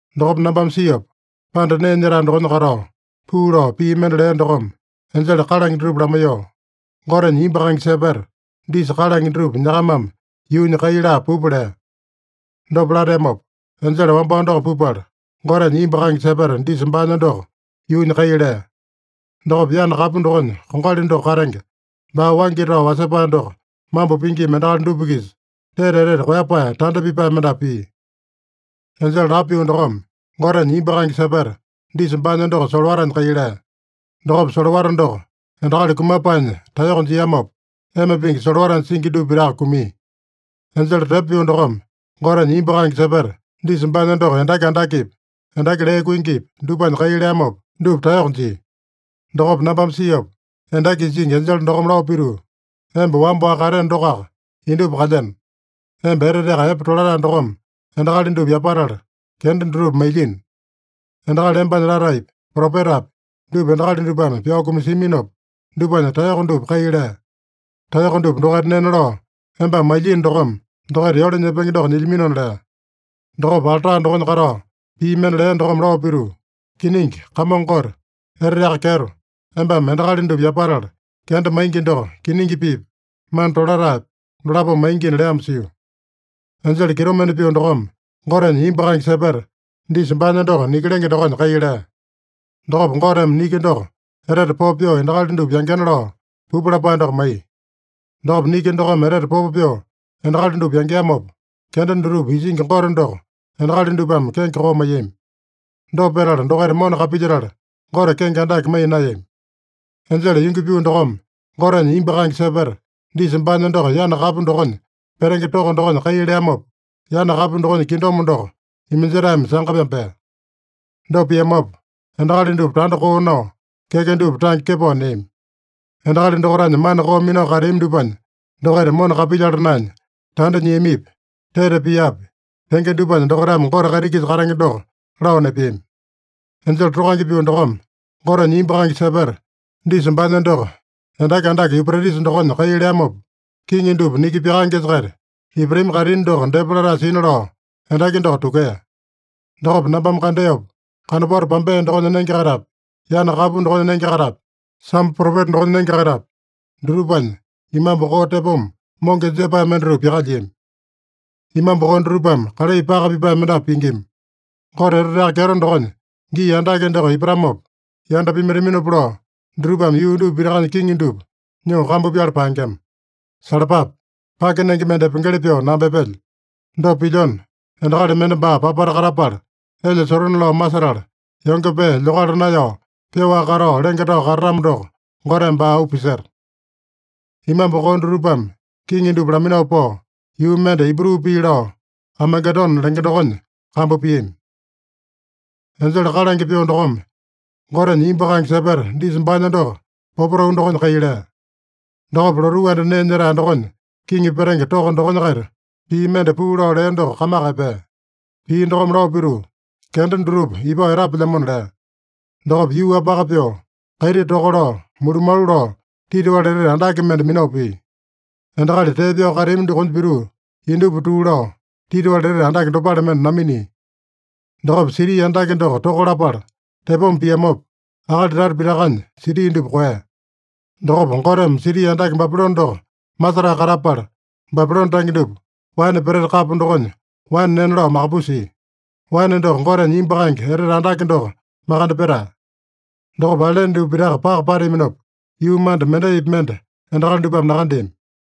Dokopa nambame siopa, panda nee nyetae dokonya katao, puu lao pii mende lea dokome enjele kalange dutupa lamaiyoo, “Gotenya imbu kaenge sepeta, disa kalange dutupa nyakamame yuunya kai laa pupa” lea. Dopa lateamopa, enjele wambao doko pupala, Gotenya imbu kaenge sepeta disa baanya doko yuunya kai lea. Dokopa yana kapu dokonya kongali doko katenge, baa waingi tao wasepae doko mambo pingima endakali dupa-kisa, tete etete koeyapae tanda pipae mendapu pia. Enjele lapo pyoo dokome Gotenya imbu kaenge sepeta disa baanya doko solowatanya kai lea. Dokopa solowata doko endakali kumapaenya taeyoko jiamopa, ema pingi solowatanya singi dupa pitaka kumia. Enjele tepo pyoo dokome Gotenya imbu kaenge sepeta disa baanya doko endaki andakepi, endaki lee kuingipi, dupanya kai leamopa, dupa taeyoko jia. Dokopa nambame siopa, endaki isingi enjele dokome lao pituu, “Emba wamba-waka kateeno dokoaka, indupa kalyeno. Emba eteteaka epe tolatae dokome endakali dupa yapatala, kenda dutupa mailyino. Endakali embanya lataepi, propetapi, dupa endakali dupame pyao kumasiaminopa, dupanya taeyoko dupa kai lea. Taeyoko dupa dokaita nena lao embame mailyino dokome, dokaita yole nyepenge doko nyilyaminona” lea. Dokopa alta dokonya katao pii mende lea dokome lao pituu, “Kiningi, Kamongo Gote, Eteteaka Kyeto, embame endakali dupa yapatala kenda maingi doko, kiningi piipa, mana tolataepa, dolapome maingina” leamo sio. Enjele kitomende pyoo dokome Gotenya imbu kaenge sepeta disa baanya doko niki lenge dokonya kai lea. Dokopa Goteme niki doko etete popo pyoo endakali dupa yangena lao, pupu lapae doko maiya. Dokopa niki dokome etete popo pyoo endakali dupa yangeamopa, kenda dutupa isingi Gote doko endakali dupame kenge koo maiyami. Dopa petala dokaita mona kapilyetala, Gote kenge andake maiya naeyami. Enjele yungi pyoo dokome Gotenya imbu kaenge sepeta disa baanya doko yana kapu dokonya petenge toko dokonya kai leamopa, yana kapu dokonya kingdom doko iminjetaeme sanga pyambea. Dopa piamopa, endakali dupa tanda koo nao, keke dupa tange kepao neami. Endakali dokaitanya mana koo minao kateami dupanya dokaita mona kapilyala naenya, tanda nyiamipi, tete piapi, tenge dupanya dokaitame Gote kaiti-kisa katenge doko lao nepeami. Enjele tokange pyoo dokome Gotenya imbu kaenge sepeta disa baanya doko endaki andake Yupretisa dokonya kai leamopa, kiŋi dupa niki pyakaengesa-kaita ipatami kaitini doko depa latae sina lao endaki doko tukea. Dokopa nambame kandeopa, kanopato pambea dokonya nenge-kaitapi, yana kapu dokonya nenge-kaitapi, sambo propeta dokonya nenge-kaitapi, dutupanya imambu koo tepoma, monge jepae mendatupa pyakalyiami. Imambu koo dutupame kalai paka pipae mendapu pingima. Gote eteteaka kyeto dokonya gii andake doko ipatamopa yanda pimaitaminopa lao, dutupame yuu dupa pitakanya kiŋi dupa nyoo kambu pyala paengema. (“Salapape! Pake nenge mende epengeli pyoo namba epelyo. Dopa pilyona, endakali mende baa papata katapala elya sotone-lao masetala, yonge pee lyokala naeyao pyoaka katao lenge tao katatamo doko, Goteme baa auu piseta.”) Imambu koo dutupame kiŋi dupa laminao pao, yuu mende Ibru pii lao Amagedone lenge dokonya kambu piami. Enjele kalange pyoo dokome Gotenya imbu kaenge sepeta disa baanya doko popotau dokonya kai lea. Dokopa lotuu anda nee nyetae dokonya kiŋi petenge toko dokonya-kaita pii mende puu lao lea doko kamaka epea. Pii dokome lao pituu, “Kenda dutupa ipao etapelyamona” lea. Dokopa yuu-wapaka pyoo, kaiti toka lao, mulumalu lao, titiwali etete andake mende minao pia. Endakali tee pyao kateami dokonya pituu, indupa tuu lao, titiwali etete andake dopale mende naminia. Dokopa siti andake doko toka lapala tepoma piamopa, akali tata pitakanya siti dupa koeya. Dokopa Goteme siti andake Babilone doko masetae katapala, Babilone tange dupa waene peteta kapo dokonya waene nena lao makapusia. Waene doko Gotenya imbu kaenge etete andake doko makande petae. Dokopa ailene dupa pitaka paka pateaminopa, yuu manda mendaipi mende endakali dupame nakandeami.